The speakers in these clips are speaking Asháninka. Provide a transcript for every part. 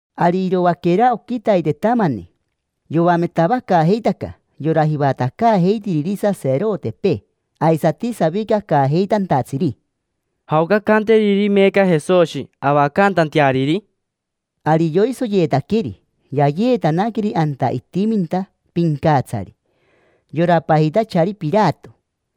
Ari iroaquera oquitaitetamani, yoametavacaajeitaca yora jivatacaajeitiriri saserotepee aisati savicacaajeitantatsiri: —¿Jaoca ancanteriri meeca Jesoshi avacantanteariri? Ari yoisoyeetaqueri, yayeetanaqueri anta itiminta pincatsari, yora pajitachari Pirato.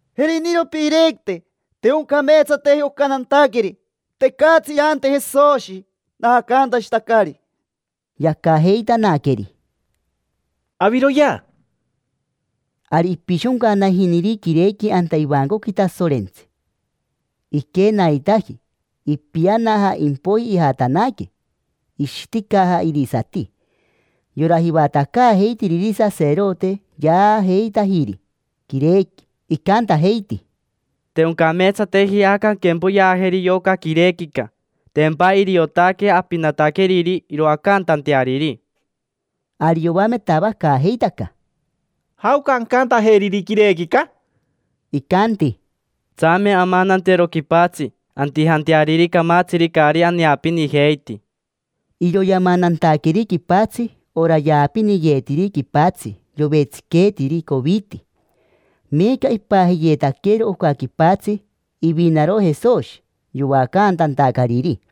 —Jeriniro piirequite. Te oncameetsateji oca nantaqueri. Tecatsi irante Jesoshi, naacantashitacari. Yacajeitanaqueri: —Jm, aviroyea. Ari ipishoncanajiniri quirequi anta ivancoqui Tasorentsi, iquenaitaji, ipianaja. Impoiji ijatanaque, ishiticaja irisati. Yora jivatacaajeitiriri saserote yaajeitajiri quirequi, icantajeiti: —Te oncameetsateji aca anquempoyeajeri yoca quirequica. Tempa iriotaque apinataqueriri iroacantanteariri. Ari yoametavacaajeitaca: —¿Jaoca ancantajeriri quirequica? Icanti: —Tsame amanantero quipatsi antijanteariri camatsiri caari aneapinijeiti. Iro yamanantaqueri quipatsi ora yaapiniyeetiri quipatsi yovetsiqueetiri coviti. Meeca ipajiyeetaquero oca quipatsi: “Ivinaro Jesoshi yoacantantacariri”.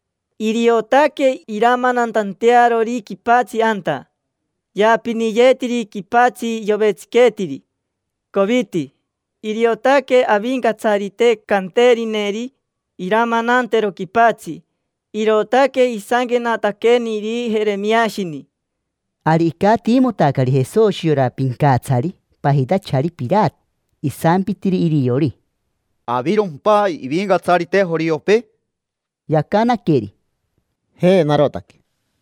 Iriotaque iramanantantearori quipatsi anta yaapiniyeetiri quipatsi yovetsiqueetiri coviti. Iriotaque Avincatsarite canterineri iramanantero quipatsi”. Irootaque isanquenataqueniri Jeremiashini. Ari icatiimotacari Jesoshi yora pincatsari pajitachari Pirato. Isampitiri iriori: —¿Avirompa ivincatsarite joriopee? Yacanaqueri: —Je, narotaque.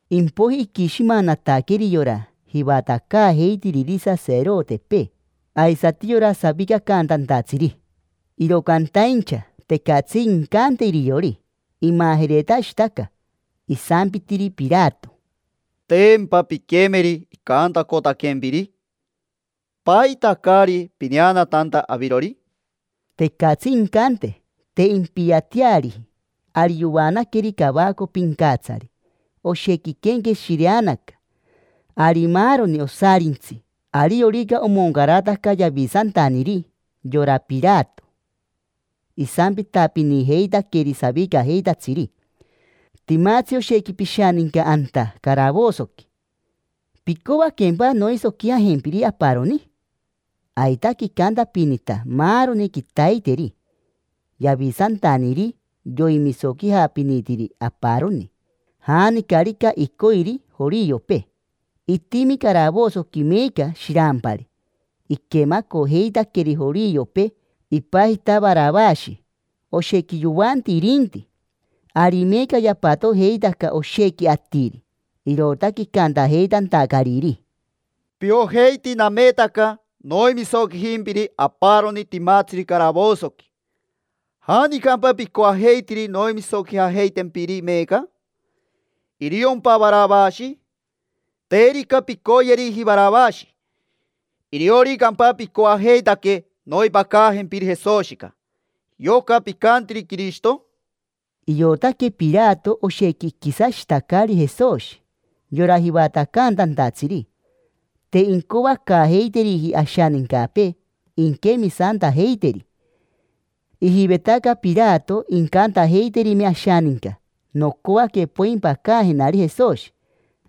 Impoiji iquishimanataqueri yora jivatacaajeitiriri saserotepee aisati yora savicacantantatsiri, iro cantaincha tecatsi incante iriori, imajeretashitaca. Isampitiri Pirato: —¿Tempa pinquemeri icantacotaquempiri? ¿Paita caari pineanatanta avirori? Tecatsi incante, te impiateariji. Ari yoanaqueri cavaco pincatsari, oshequi iquenqueshireanaca. Ari maaroni osarintsi, ariorica omoncarataca Yavisantaniri, yora Pirato isampitapinijeitaqueri savicajeitatsiri: “Timatsi oshequi pishaninca anta caravosoqui. ¿Picoaquempa noisoquijajempiri aparoni?” Aitaque icantapinita maaroni quitaiteri Yavisantaniri, yoimisoquijapinitiri aparoni, janicarica icoiri joriopee. Itimi caravosoqui meeca shirampari iquemacojeitaqueri joriopee, ipajita Varavashi: oshequi yoanti irinti. Ari meeca yapatojeitaca oshequi atiri, irootaque icantajeitantacariri: —Piojeiti nametaca noimisoquijimpiri aparoni timatsiri caravosoqui. ¿Janicampa picoajeitiri noimisoquijajeitempiri meeca? ¿Iriompa Varavashi? Terica pincoyeriji Varavashi, ¿irioricampa picoajeitaque noimpacajempiri Jesoshica, yoca picantiri Quirishito? Iotaque Pirato oshequi iquisashitacari Jesoshi yora jivatacantantatsiri, te incoacaajeiteriji ashanincapee inquemisantajeiteri. Ijivetaca Pirato incantajeiterime ashaninca: “Nocoaque poimpacajenari Jesoshi”.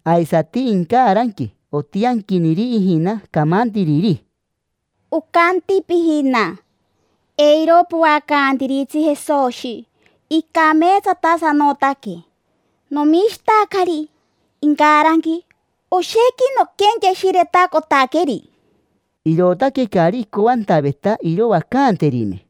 Aisati incaranqui otianquiniri ijina camantiriri: “Ocanti pijina: ‘Eiro poacantiritsi Jesoshi, icameetsatasanotaque. Nomishitacari incaranqui, oshequi noquenqueshiretacotaqueri’”. Irootaque caari icoantaveta iroacanterime.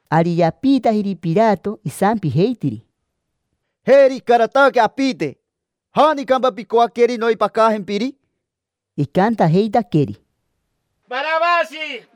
Ari yapiitajiri Pirato, isampijeitiri: —Jeri icarataque apite: ¿janicampa picoaqueri noimpacajempiri? Icantajeitaqueri: —Varavashi.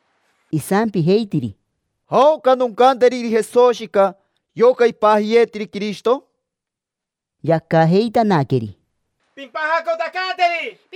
Isampijeitiri: —¿Jaoca noncanteriri Jesoshica: yoca ipajiyeetiri Quirishito? Yacajeitanaqueri: —Pimpajacotacanteri.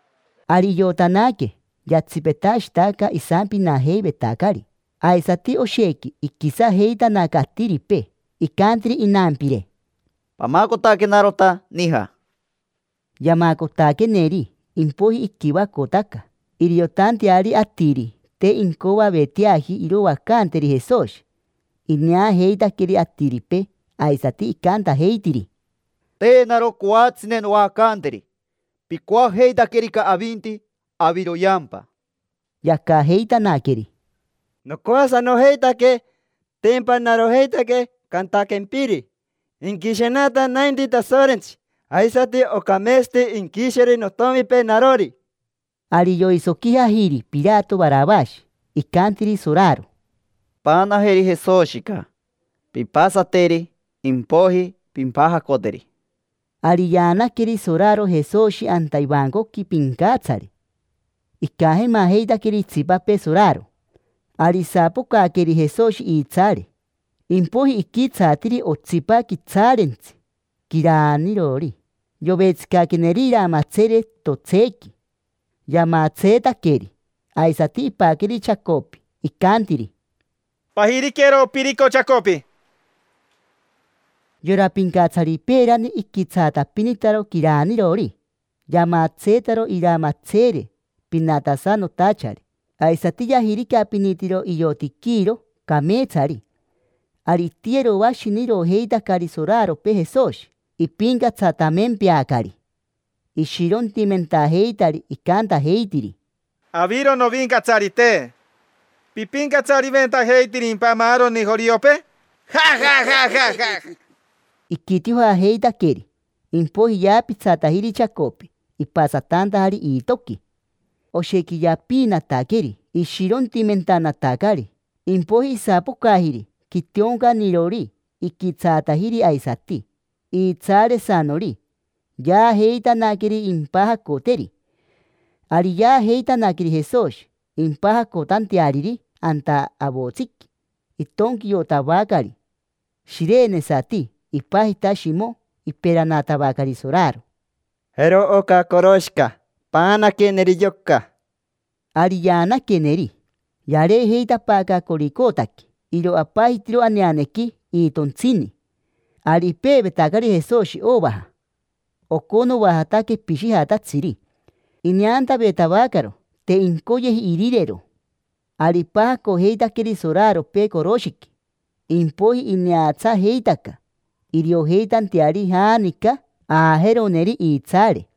Ari iotanaque yatsipetashitaca isampinajeivetacari, aisati oshequi iquisajeitanaca atiripee. Icantiri inampire: —Pamacotenarota nija. Yamacotaqueneri, impoiji iquivacotaca, iriotanteari atiri te incoaveteaji iroacanteri Jesoshi. Ineajeitaqueri atiripee, aisati icantajeitiri: —Te naro coatsine noacanteri. Picoajeitaquerica avinti, aviroyeampa. Yacajeitanaqueri: —Nocoasanojeitaque, tempa narojeitaque cantaquempiri. Inquishenata nainti Tasorentsi, aisati ocameetsati inquisheri notomipee narori. Ari yoisoquijajiri Pirato Varavashi. Icantiri soraro: —Paanajeri Jesoshica, pimpasateri, impoiji pimpajacoteri. Ari yaanaqueri soraro Jesoshi anta ivancoqui pincatsari, icajemajeitaqueri itsipapee soraro. Ari isapocaqueri Jesoshi iitsaare, impoiji iquitsaatiri otsipa quitsaarentsi, quiraanirori. Yovetsicaqueneri iramatseere totsequi, yamatseetaqueri. Aisati ipaqueri chacopi, icantiri: —Pajiriquero opirico chacopi. Yora pincatsari peerani iquitsaatapinitaro quiraanirori, yamatseetaro iramatseere pinatasanotachari, aisati yajiricapinitiro iotiquiro cameetsari. Ari itiyeroashinirojeitacari soraropee Jesoshi, ipincatsatamempeacari, ishirontimentajeitari, icantajeitiri: —Aviro, novincatsarite. ¿Pipincatsariventajeitirimpa maaroni joriopee? Iji, iji, iji, iji. Iquitiojajeitaqueri, impoiji yaapitsatajiri chacopi, ipasatantajari iitoqui. Oshequi yapiinataqueri ishirontimentanatacari, iji, iji, iji. Impoiji isapocajiri quitioncanirori, iquitsaatajiri aisati iitsaaresanori. Yaajeitanaqueri impajacoteri. Ari yaajeitanaqueri Jesoshi impajacotanteariri. Anta avotsiqui itonquiotavacari shirenesati, ipajita Shimo. Iperanatavacari soraro: —Jero oca coroshica, paanaqueneri yoca. Ari yaanaqueneri. Yareejeitapaaca Coricotaqui. Iro apajitiro aneanequi: iitontsini. Ari ipeevetacari Jesoshi ovaja, oconoajata quepishijatatsiri. Ineantavetavacaro, te incoyeji irirero. Ari ipajacojeitaqueri soraropee coroshiqui, impoiji ineatsajeitaca iriojeitanteari janica aajeroneri iitsaare.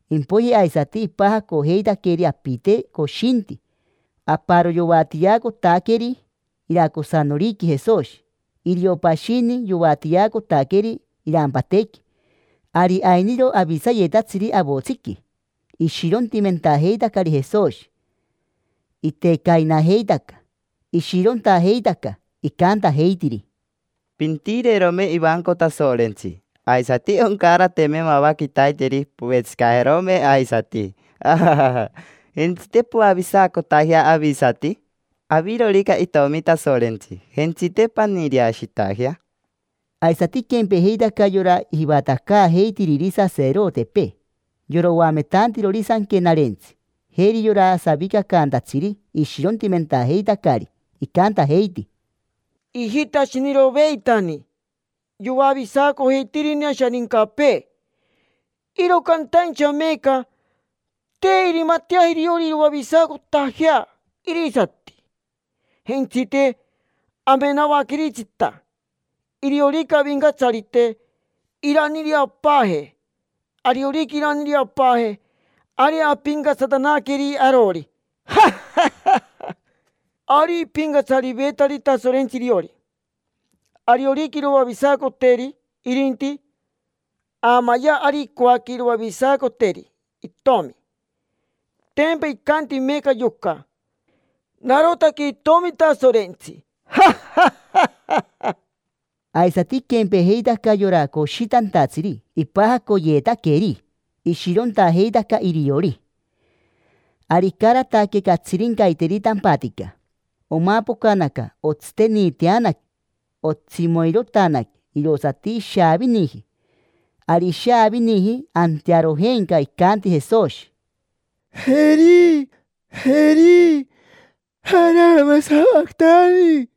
Impoiji aisati ipajacojeitaqueri apite coshinti: aparo yoatiacotaqueri iracosanoriqui Jesoshi, irio pashini yoatiacotaqueri irampatequi. Ari ainiro avisayetatsiri avotsiqui, ishirontimentajeitacari Jesoshi. Itecainajeitaca, ishirontajeitaca, iji, iji, iji. Icantajeitiri: —Pintireerome ivanco Tasorentsi, aisati oncarate mava quitaiteri povetsicajerome aisati. Jentsite, poavisacotajea avisati. Avirorica itomi Tasorentsi, jentsite paniireashitajea. Aisati iquempejeitaca yora jivatacaajeitiriri saserotepee, yora oametantirori Sanquenarentsi, jeri yora savicacantatsiri: ishirontimentajeitacari. Icantajeiti: —Ijitashiniroveitani yoavisacojeitirini ashanincapee, iro cantaincha meeca te irimatajeaji iriori iroavisacotajea irisati. Jentsite, amenavaqueritsita: iriorica avincatsarite, iraniireapaaje. Ariorica iraniireapaaje, ari ampincatsatanaqueri arori. Iji, iji, iji. Ari ipincatsarivetari Tasorentsi iriori: ariorica iroavisacoteri irinti. Aamayea ari incoaque iroavisacoteri itomi, tempa icanti meeca yoca: “Narotaque Itomi Tasorentsi”. Iji, iji, iji. Aisati iquempejeitaca yora coshitantatsiri ipajacoyeetaqueri: ishirontajeitaca iriori. Ari icarataque catsirincaiteri tampatica, omapocanaca otsiteniiteanaque, otsimoirotanaque: irosati ishaaviniji. Ari ishaaviniji antearojenca icanti Jesoshi: —Eri, Eri, arama savacatani.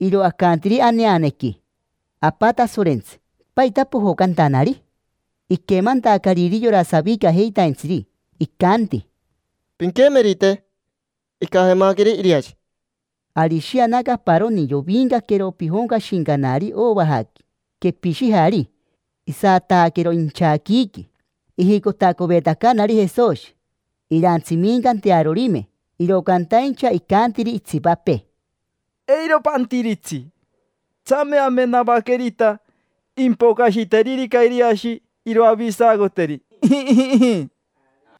Iro acantiri aneanequi: “Apa Tasorentsi, ¿paita pojocantanari?” Iquemantacariri yora savicajeitaintsiri, icanti: —Pinquemerite, icajemaqueri Iriashi. Ari ishianaca aparoni, yovincaquero pijoncashincanari ovajaqui quepishijari. Isataaquero inchaquiiqui, ijicotacovetacanari Jesoshi, irantsimicantearorime, iro cantaincha icantiri itsipapee: —Eiro pantiritsi: tsame amenavaquerita, impocashiteririca Iriashi iroavisacoteri. Iji, iji, iji.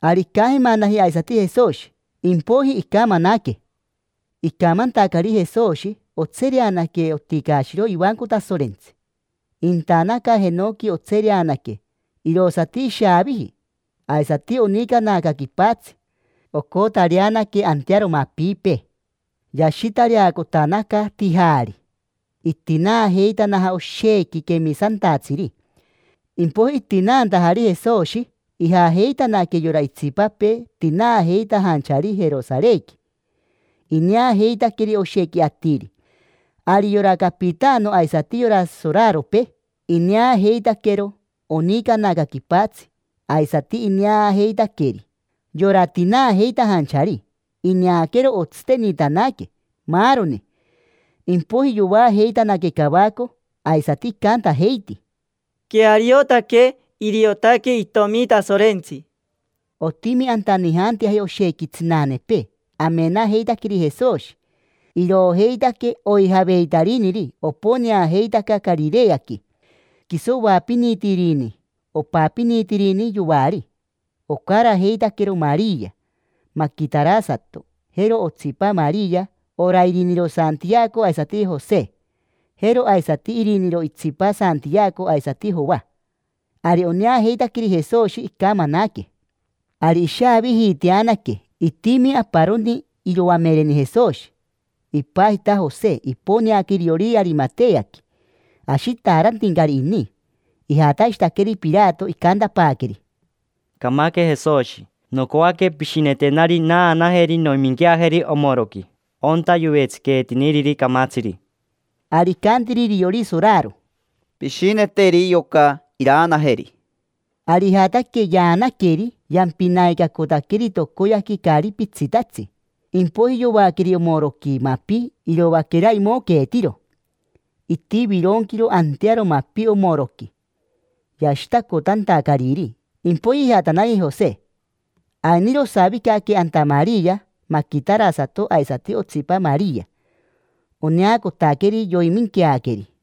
Ari icajemanaji aisati Jesoshi, impoiji icamanaque, torein. Icamantacari Jesoshi, otsereanaque oticaashiro ivanco Tasorentsi: intanaca jenoqui otsereanaque, tsererere, irosati ishaaviji. Aisati onicanaca quipatsi, nica, nica, nica; ocotareanaque antearo mapipee. Yashitareacotanaca tijaari, itinaajeitanaja oshequi quemisantatsiri, tinare. Impoiji, itinaantajari Jesoshi, ijajeitanaque yora itsipapee tinaajeitajanchari Jerosarequi. Ineajeitaqueri oshequi atiri. Ari yora capitano aisati yora soraropee ineajeitaquero onicanaca quipatsi, aisati ineajeitaqueri yora tinaajeitajanchari, ineaquero otsiteniitanaque, maaroni. Impoiji yoajeitanaque cavaco, aisati icantajeiti: —Queariotaque: iriotaque Itomi Tasorentsi. Otimi anta nijanteaji oshequi tsinanepee, amenajeitaqueri Jesoshi. Iroojeitaque oijaveitariniri, oponeajeitaca Carireaqui. Quiso oapinitirini, opapinitirini yoari. Ocarajeitaquero Maria maquitarasato; jero otsipa Maria: ora iriniro Santiaco aisati Jose; jero aisati iriniro itsipa Santiaco aisati Joa. Ari oneajeitaqueri Jesoshi, icamanaque. Ari ishavijiiteanaque. Itimi aparoni iroamereni Jesoshi, ipajita Jose. Iponeaca iriori Arimateaqui; ashitaarantincari ini. Ijatashitaqueri Pirato, icantapaaqueri: —Camaque Jesoshi. Nocoaque pishinetenari naanajeri noiminquiajeri omoroqui: onta yovetsiqueetiniriri camatsiri. Ari icantiri iriori soraro: —Pishineteri yoca iraanajeri. Ari ijataque, yaanaqueri, yampinaicacotaqueri tocoyaqui caari pitsitatsi. Impoiji yoaqueri omoroqui mapi iroaquera imoqueetiro. Itivironquiro antearo mapi omoroqui, yashitacotantacariri. Impoiji ijatanaji Jose. Ainiro osavicaque anta Maria maquitarasato aisati otsipa Maria. Oneacotaqueri yoiminqueaqueri.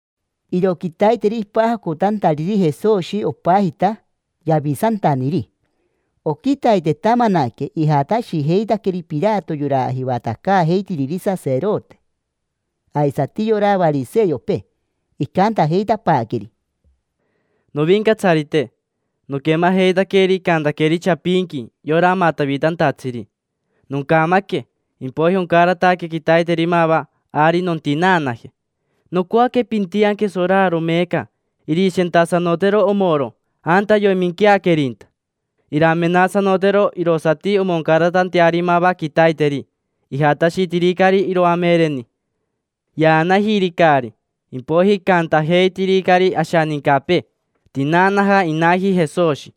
Iro quitaiteri ipajacotantariri Jesoshi opajita Yavisantaniri. Oquitaitetamanaque ijatashijeitaqueri Pirato yora jivatacaajeitiriri saserote aisati yora variseopee. Icantajeitapaaqueri: —Novincatsarite, noquemajeitaqueri icantaqueri chapinqui yora amatavitantatsiri: “Noncamaque, impoiji oncarataque quitaiteri mava, ari nontinaanaje”. Nocoaque pintianque soraro meeca irishentasanotero omoro anta yoiminqueaquerinta. Iramenasanotero irosati omoncaratanteari mava quitaiteri. Ijatashitiricari iroamereni, yaanajiricari. Impoiji icantajeitiricari ashanincapee: “Tinaanaja inaji Jesoshi”.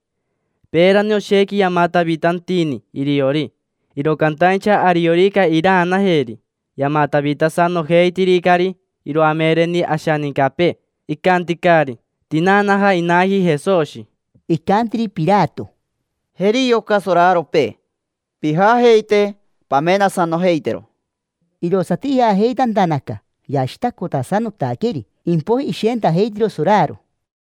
Peerani oshequi yamatavitantini iriori, iro cantaincha ariorica iraanajeri, yamatavitasanojeitiricari iroamereni ashanincapee, icanticari: “Tinaanaja inaji Jesoshi”. Icantiri Pirato: —Jeri yoca soraropee, pijajeite pamenasanojeitero. Irosati ijajeitantanaca, yashitacotasanotaqueri, impoiji ishentajeitiro soraro.